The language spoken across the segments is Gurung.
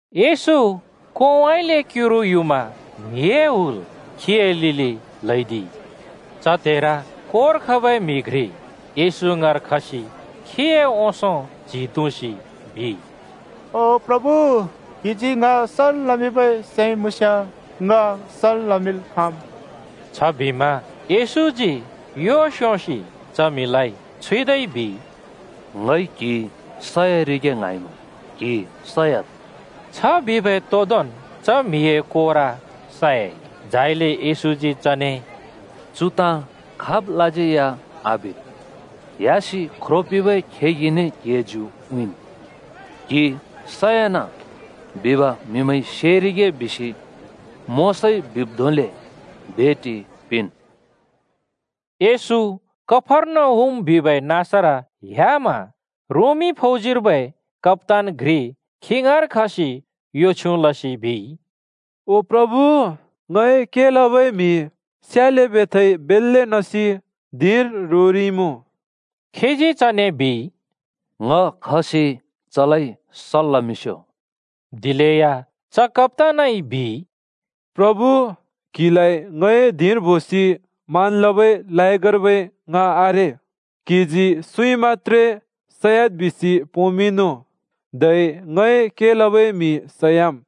येशू कोंउँइँले क्‍युरु युमा म्हिए हुल खीए लिलि ल्‍हैदिइ। च त्हेर कोर खबै म्हि घ्रि येशू ङाँर खसि खीए ओंसों च्हि तुँसि बिइ, “ओ प्रभु, क्हिजी ङ सल् लमिंबै सैं मुँस्‍याँ ङ सल् लमिंल् खाँम्।” छबिमा येशूजी यो स्‍योंसि च म्हिलाइ छुइदै बिइ, “ङइ क्हि सरिगे ङ्हाँइमुँ। सयाद्।” छ बिबै तोदोंन् च म्हिए कोर सयाइ। झाइले येशूजी चने, “चु ताँ खाबलाज्यै या आबिद्। ह्‍यासि ख्रो पिंबै खेगिने क्हिए ज्यु उँइँन्, ‘क्हि सयना’ बिब म्हिमैंइ सेरिगे बिसि मोशाइ बिब् धोंले भेटि पिंन्।” येशू कफर्नहुम बिबै नाँसर ह्‍यामा रोमी फौजीर्बै कप्‍तान घ्रि खी ङाँर खसि यो छ्युँ लसि बिइ, “ओ प्रभु, ङए के लबै म्हि स्याले बेथाइ बेल्‍ले नसि धिंर रोरिइमुँ।” खीजी चने बिइ, “ङ खसि चलाइ सल् लमिंस्‍यो।” दिलेया च कप्‍तानइ बिइ, “प्रभु, क्‍हिलाइ ङए धिंर बोसि मान लबै लायगर्बै ङ आरे। क्‍हिजी सुँइ मत्‍त्रे सयाद् बिसि पोंमिंनु, धै ङए के लबै म्हि सयाम्।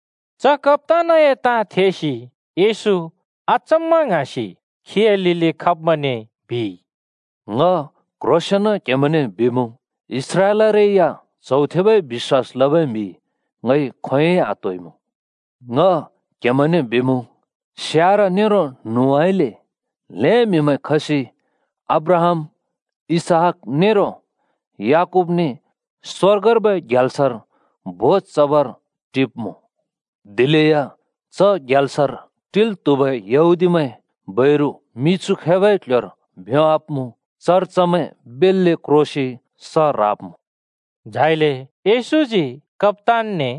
च कप्‍तानए ताँ थेसि येशू अचम्मा ङ्हाँसि खीए लिलि खब्‍मैंने बिइ, “ङ क्ह्रोंसेंन क्हेमैंने बिमुँ, इस्राएलरै या च्हौ थेबै बिश्‍वास लबै म्‍हि ङइ खोंयोंइ आत्होइमुँ। ङ क्हेमैंने बिमुँ, स्यार (पूर्व) नेरो न्हुउँइँले (पश्‍चिम) ल्‍हें म्‍हिमैं खसि अब्राहाम, इसहाक नेरो याकूबने स्वर्गर्बै ग्याल्सर भोज चबर टिब्‍मुँ। दिलेया च ग्याल्सर टिल् त्हुबै यहूदीमैं बैरु मिछु खैबै क्‍ल्‍ह्‍योर भ्योंवाब्‍मुँ। चर चमैं बेल्‍ले क्रोसि स ह्राब्‍मुँ।” झाइले येशूजी कप्‍तानने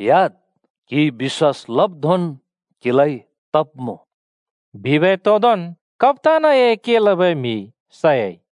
“ह्‍याद्! क्‍हिइ बिश्‍वास लब् धोंन् क्हिलाइ तब्मुँ।” बिबै तोदोंन् कप्‍तानए के लबै म्हि सयाइ।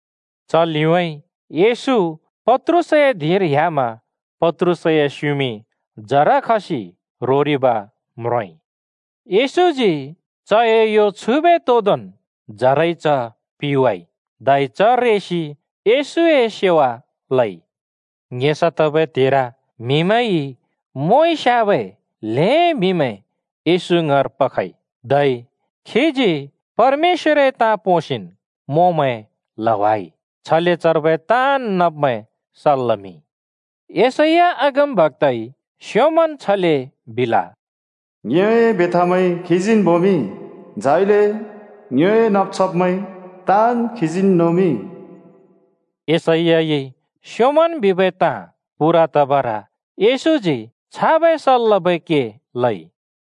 च लिउँइँ येशू पत्रुसए धिंर ह्‍यामा पत्रुसए स्‍युमिं जर खसि रोरिब् म्रोंइ। येशूजी चए यो छुइबै तोदोंन् जरइ च पिवाइ। धै च रेसि येशूए सेवा लइ। ङेसा तबै त्हेर म्‍हिमैंइ मोंइ स्‍याबै ल्‍हें म्‍हिमैं येशू ङाँर पखइ। धै खीजी परमेश्‍वरए ताँ पोंसिन् मोंमैं ल्‍हावाइ। छले चर्बै ताँन् नब्मैं सल् लमिंइ। यशैया अगमबक्‍ताइ स्‍योंमन् छले बिल, “ङ्योए बेथामैं खीजीन् बोमिंइ, झाइले ङ्योए नब् छब्मैं ताँन् खीजीन् नोमिंइ।” येशैयाइ स्योंमन् बिबै ताँ पूरा तबर येशूजी छाबै सल् लबै के लइ।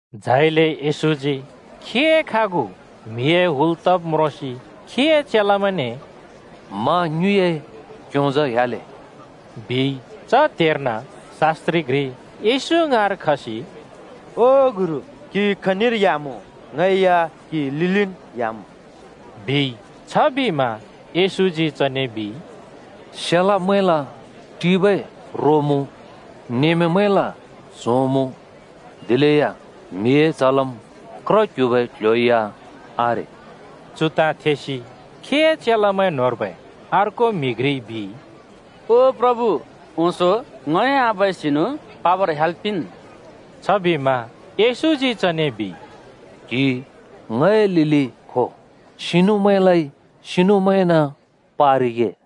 झाइले येशूजी खीए खागु म्हिए हुल तब् म्रोंसि खीए चेलामैंने “मा ङ्युँइए क्‍योंजा ह्‍याले,” बिइ। च त्हेर्न शास्त्रि घ्रि येशू ङाँर खसि “ओ गुरु, क्‍हि खनिर ह्‍यामुँ ङ या क्‍हिए लिलिन् ह्‍याम्,” बिइ। छबिमा येशूजी चने बिइ, “स्‍येलमैंला टिबै रो मुँ, नमेमैंला च्‍हों मुँ, दिलेया ‘म्हिए च्हलम्’ क्र क्ह्‍युबै क्‍ल्‍ह्‍यो या आरे।” चु ताँ थेसि खीए चेलामैं न्होंर्बै अर्को म्हि घ्रिइ बिइ, “ओ प्रभु, ओंसों ङए आबाए सिनु पाबर ह्‍याल् पिंन्।” छबिमा येशूजी चने बिइ, “क्हि ङए लिलि खो। सिनुमैंलाइ सिनुमैंन पारिगे।”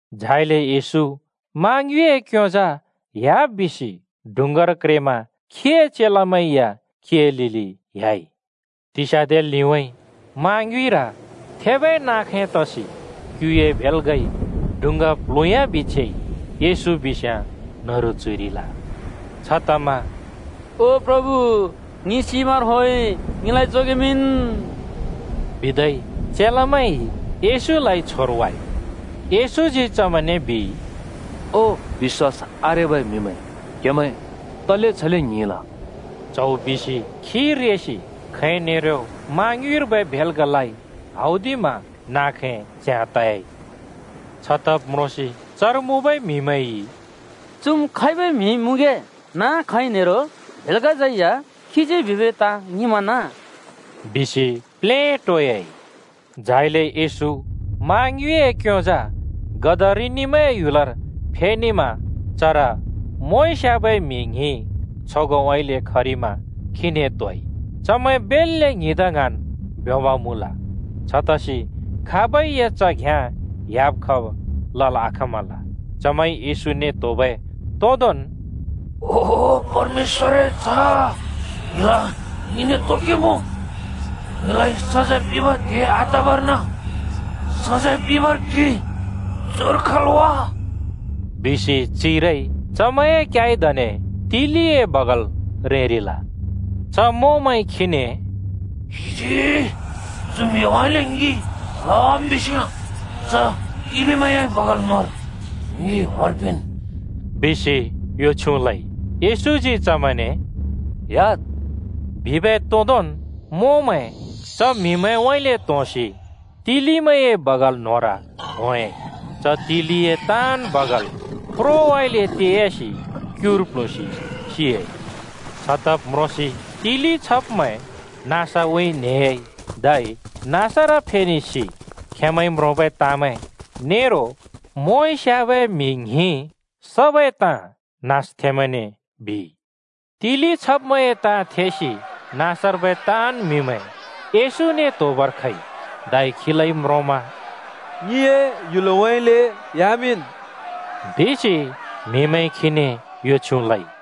झाइले येशू मा ङ्युँइए क्‍योंजा ह्‍याब् बिसि डुँङ्गार क्रेमा खीए चेलामैं या खीए लिलि ह्‍याइ। तिस्याँदे लिउँइँ मा ङ्युँइर थेबै नाँ खैं तसि क्‍युए भेल्‍गाइ डुँङ्गा प्ल्हुँयाबि छेइ। येशू बिस्‍याँ न्‍हरु च्‍हुइरिल। छतमा “ओ प्रभु, ङि सिबर होंइ ङिलाइ जोगेमिंन् बिदै चेलामैंइ येशूलाइ छोरवाइ।” येशूजी चमैंने बिइ, “ओ बिश्‍वास आरेबै म्हिमैं, क्हेमैं तले छले ङ्हिंल?” च्‍हौ बिसि खी रेसि खैं नेरो मा ङ्युँइर्बै भेल्‍गालाइ हौदिमा नाँ खैं च्याँ त‍याइ। छतब् म्रोंसि चर मुँबै म्‍हिमैंइ, “चुम् खैबै म्हि मुँगे नाँ, खैं नेरो भेल्‍गाज्‍यै या खीजी बिबै ताँ ङिंमना बिसि प्लेटोयाइ।” झाइले येशू मा ङ्युँइए क्‍योंजा गदरिनिमैंए ह्‍युलर फेनेमा चर मोंइ स्याबै म्हि ङ्हिं छगोंउँइँले खरिमा खीने त्‍होइ। चमैं बेल्‍ले ङ्हिंदा ङ्हाँन् ब्योंब मुँल। छतसि खाबै या च घ्याँ ह्‍याब खब लल् आखाँमल। चमैंइ येशूने त्‍होबै तोदोंन् “ओ परमेश्‍वरए च्‍ह, क्हिला ङिने तो के मुँ? ङिलाइ सजैं पिंबै त्हे आतबर्न सजैं पिंबर क्हि चुर खल् वा?” बिसि चिरइ। चमैंए क्याइदने तिलिए बगाल रेंरिल। च मोंमैंइ खीने “क्हिजी चु म्‍हिमैंउँइँले ङि ल्‍हावाम् बिस्‍याँ च तिलिमैंए बगाल न्‍होंर होंल् पिंन्,” बिसि यो छ्युँ लइ। येशूजी चमैंने “ह्‍याद्!” बिबै तोदोंन् मोंमैं च म्‍हिमैंउँइँले त्‍होंसि तिलिमैंए बगाल न्‍होंर होंयाँइ। धै तिलिए ताँन् बगाल प्रोउँइँले ते‍यासि क्युर प्ल्हुँसि सियाइ। छतब् म्रोंसि तिलि छब्मैं नाँसउँइँ नेह्‍याइ, धै नाँसर फेनेसि खेंमैंइ म्रोंबै ताँमैं नेरो मोंइ स्‍याबै म्‍हि ङ्हिं सबै ताँ नाँसथेंमैंने बिइ। तिलि छब्मैंए ताँ थेसि नाँसर्बै ताँन् म्‍हिमैं येशूने त्‍होबर खइ, धै खीलाइ म्रोंमा “ङिए ह्‍युलउँइँले ह्‍यामिंन्,” बिसि म्हिमैंइ खीने यो छ्युँ लइ।